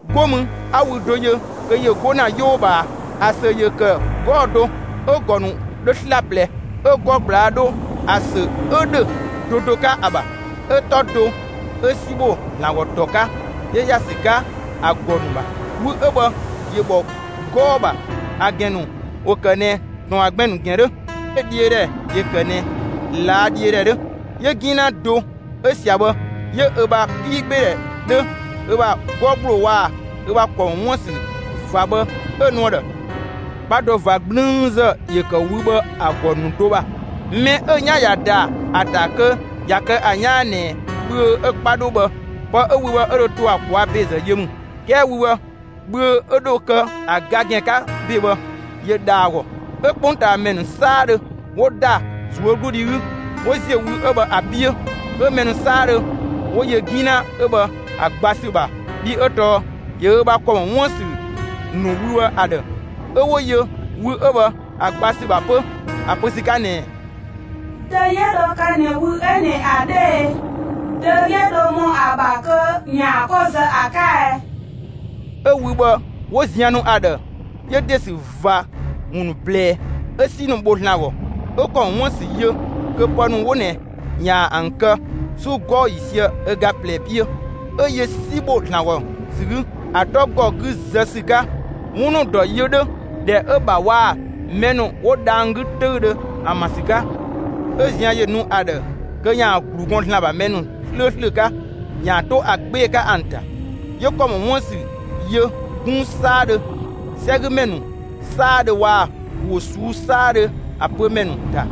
'Go mü 'a wü do yö kö ‑yö 'go ‑na 'yoo ꞊bhaa. ‑A ‑sö ‑yö ‑kë 'gɔɔ‑ do, 'ö‑ ‑gɔ ‑nu 'dhö 'slaplɛ; 'ö 'gɔ ꞊gblaa' 'dho ‑a ‑sö 'ö ‑dhö do do 'ka ‑a ‑bha. 'Ö 'tɔ do 'ö 'si ‑bho ‑Zlan ‑gɔ ‑tɔ 'ka 'yö ‑ya ‑sü 'ka ‑a ‑gɔ ‑nu ‑bha. Wü 'ö bhë ‑yö ‑bhɔ 'gɔɔ‑ ‑bha. ‑A ‑gɛn ‑nu ‑wo ‑kë ꞊nɛ ‑tɔn ‑bha gbɛn‑ ‑nu ‑gɛn 'dhö, 'ö‑ dhiö ‑dhɛ ‑yö ‑kë ꞊nɛ ꞊laa' dhiö ‑dhɛ 'dhö. 'Yö 'gina do 'ö ꞊sia bhë 'yö ö ‑bha 'piigbeedhɛ 'dhö, ö ‑bha 'gɔ ‑gbloo waa‑ ö ‑bha ‑kɔ ‑mɔ 'wuën‑ ‑sü ꞊va bhë 'ö‑ nu ‑a ‑dhë. 'Kpa do ꞊va 'gblüünzë ‑yö ‑kë wü bhë ‑a ‑gɔ ‑nu do ‑bha. Mɛ 'ö 'yan ꞊ya ‑da ‑a ‑ta kö ꞊ya kë ‑a 'yaan ꞊nɛ bhüö 'ö‑ 'kpa 'dhö bhë, pë 'ö wü 'ö bhë 'ö dho to ꞊a ꞊kwaa' ‑bezë yö ‑mü. 'Kɛɛ wü bhë bhüö 'ö dho kë ‑a ga ‑gɛn 'ka ‑be bhë, ‑yö ‑dha ‑a ‑gɔ. 'Ö 'kpongtaamɛ ‑nu 'saadhö 'wo ‑da ꞊zuögludhi 'gü, 'wo ‑ziö wü 'ö bhë ‑a 'piö. 'Ö mɛ ‑nu 'saadhö 'wo yö 'gina 'ö bhë ‑a gba ‑sü ‑bha, bhii 'ö tɔɔ ‑yö ö ‑bha ‑kɔ ‑mɔ 'wuën‑ ‑sü ‑nu wü 'ö bhë ‑a ‑dhë. 'Ö 'wo yö wü 'ö bhë ‑a gba ‑sü ‑bha 'pö ‑a pö ‑sü 'ka ꞊nɛɛ: «Dö 'yö dho kë ꞊nɛ wü 'ö ꞊nɛ ‑a 'dhö e? Dö 'ö dho ‑mɔ ‑a ‑bha kö ‑yaan 'ko zë ‑a 'ka ɛ?» 'Ö wü bhë 'wo zian nu ‑a ‑dhë, 'yö ‑de ‑sü ꞊va ‑wun ‑nu ꞊blɛɛ, 'ö 'si ‑nu bho ‑Zlan ‑gɔ; 'ö ‑kɔ ‑mɔ 'wuën‑ ‑sü yö kö pë ‑nu 'wo ꞊nɛ ‑yaan ‑an kë 'su 'gɔɔ‑ ‑yiisië ö ga ꞊plɛ 'piö. 'Ö yö 'si ‑bho ‑Zlan ‑gɔ ‑sü 'gü, ‑a 'tɔ ‑gɔ 'gü zë ‑sü 'ka, 'wun ‑nu ‑dɔ yö 'dhö, ‑dhɛ 'ö‑ ‑bha waa‑ mɛ ‑nu 'wo dhang‑ 'gü 'töüdhö ‑an ‑bha ‑sü 'ka. 'Ö zian ‑yö nu ‑a ‑dhë, kö ‑yaan ‑glu gɔn ‑Zlan ‑bha mɛ ‑nu 'slööslö 'ka ‑yaan 'to ‑a 'gbee‑ 'ka ‑an ‑ta; 'yö ‑kɔ ‑mɔ 'wuën‑ ‑sü yö 'gunng 'saadhö, 'sɛgümɛ ‑nu 'saadhö waa‑ ‑wo ꞊suu'‑ 'saadhö ‑a pö ‑mɛ ‑nu ‑ta.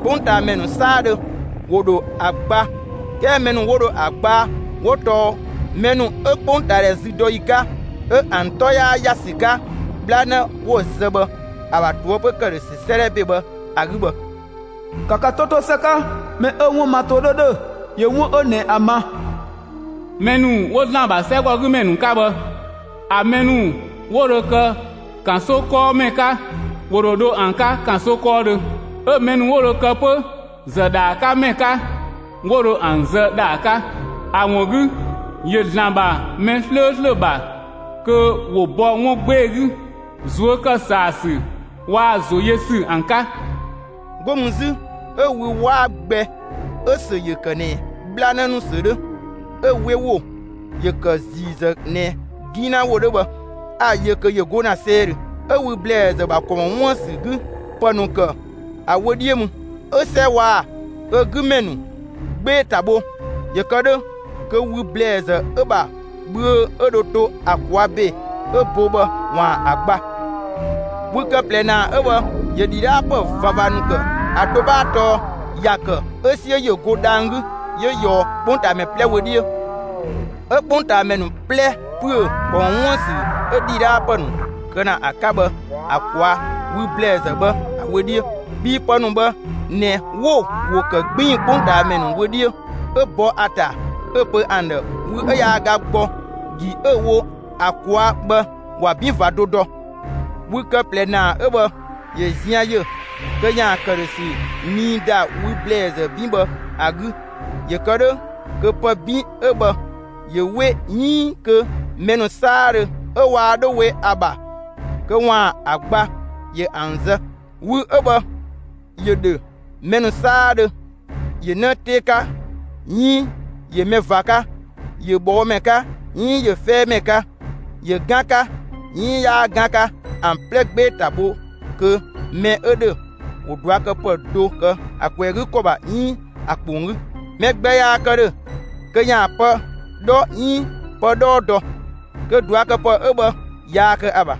'Kpongtaamɛ ‑nu 'saadhö ‑wo ‑dho ‑a gba; 'kɛɛ mɛ ‑nu 'wo dho ‑a gba 'wo tɔɔ mɛ ‑nu 'ö 'kpongtaadhɛ züdɔyi 'ka, 'ö ‑an 'tɔ yaa ‑ya ‑sü 'ka 'bhlanë 'wo‑ zë bhë ‑a ‑bha ꞊toëpö ‑këdhösü 'sëëdhɛ ‑be bhë ‑a 'gü bhë. ‑Ka ka 'to 'to ‑së 'ka! Mɛ 'ö‑ 'wun ma ‑to 'dhö ‑dhö, ‑yö 'wun 'ö ꞊nɛ ‑a ma. Mɛ ‑nu 'wo ‑Zlan ‑bha 'sɛgɔgümɛ ‑nu 'ka bhë, ‑a mɛ ‑nu 'wo dho kë ‑kanso 'kɔɔmɛ 'ka, ‑wo ‑dho dho ‑an 'ka ‑kanso 'kɔɔdhö. 'Ö‑ mɛ ‑nu 'wo dho kë 'pö ‑zë ‑dhaa 'ka ‑mɛ 'ka, 'wo dho ‑an zë ‑dhaa 'ka. ‑A ‑wun 'gü, ‑yö ‑Zlan ‑bha mɛ 'slööslö ‑bha kö ‑wo bɔ 'wun 'gbee‑ 'gü, ꞊zuö' ‑kë ‑saa ‑sü waa‑ ‑zo yö ‑sü ‑an 'ka. 'Go mü 'zü, 'ö wü 'waa gbɛ 'ö‑ ‑sö ‑yö ‑kë ꞊nɛ 'bhlanë ‑nu ‑sö 'dhö, 'ö‑ 'we ‑wo ‑yö ‑kë ‑ziizë ꞊nɛ 'gina ‑wo 'dhö bhë, 'a‑ yö kö ‑yö 'go ‑na 'sɛidhö, 'Ö wü ‑blɛɛzë ‑bha ‑kɔ ‑mɔ 'wuën‑ ‑sü 'gü ‑pë ‑nu ‑kë ‑a wö 'dhiö mü. 'Ö 'sɛ waa‑ ö 'gü ‑mɛ ‑nu 'gbee‑ ‑ta bho ‑yö kë 'dhö kö wü ‑blɛɛzë 'ö‑ ‑bha bhüö 'ö dho to ‑a ꞊kwaa' ‑be 'ö bo bhë, ‑waan ‑a gba. Wü kë ꞊plɛ ‑naa 'ö bhë, ‑yö ‑dhidhaapë ꞊vava ‑nu ‑kë; ‑a do 'bhaa tɔɔ ‑ya ‑kë 'ö 'siö ‑yö go dhang‑ 'gü 'yö ꞊yɔɔ 'kpongtaamɛ 'plɛ wö 'dhiö. 'Ö 'kpongtaamɛ ‑nu 'plɛ ‑püö, ‑kɔ ‑mɔ 'wuën‑ ‑sü 'ö ‑dhidhaapë ‑nu kë ‑na ‑a 'ka bhë ‑a ꞊kwaa' wü ‑blɛɛzë bhë ‑a wö 'dhiö. Bhii pë ‑nu bhë ꞊nɛ 'wo‑ ‑wo ‑kë 'gbiin‑ 'kpongtaamɛ ‑nu wö 'dhiö, 'ö bɔ ‑a ‑ta 'ö‑ pö ‑an ‑dhë, wü 'ö yaa ga gbɔ ‑gi 'ö‑ wo ‑a ꞊kwaa' bhë, ‑wa 'bin ꞊va do dɔ. Wü kë ꞊plɛ ‑naa 'ö bhë ‑yö zian ‑yö kö ‑yaan ‑këdhösü nii ‑da wü ‑blɛɛzë 'bin bhë ‑a 'gü, ‑yö kë 'dhö kö pë 'bin 'ö bhë ‑yö 'we 'iin kö mɛ ‑nu 'saadhö 'ö waa 'dho we ‑a ‑bha kö ‑waan ‑a gba, ‑yö ‑an zë. Wü 'ö bhë ‑yö ‑dhö mɛ ‑nu 'saadhö, ‑yö 'në 'tee 'ka 'iin ‑yö mɛ ꞊va 'ka, ‑yö ꞊bhɔɔmɛ 'ka 'iin ‑yö 'fɛɛmɛ 'ka, ‑yö 'gan 'ka 'iin 'yaa 'gan 'ka, ‑an 'plɛ 'gbee‑ ‑ta ‑bho kö mɛ 'ö ‑dhö ‑wo ꞊duakëpë do kë ‑a kwɛɛ 'gü ‑kɔ ‑bha 'iin ‑a ‑kpong 'gü. Mɛ gbɛ yaa kë ‑dhö kö ‑yaan pë 'dhɔ 'iin pë 'dhɔɔ dɔ, kö ꞊duakëpë 'ö bhë yaa kë ‑a ‑bha.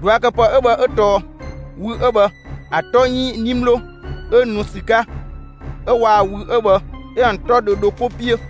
꞊Duakëpë 'ö bhë 'ö tɔɔ: Wü 'ö bhë ‑a 'tɔ 'iin 'nimlo 'ö nu ‑sü 'ka 'ö waa‑ wü 'ö bhë 'ö ‑an 'tɔ dhö dho 'ko 'piö.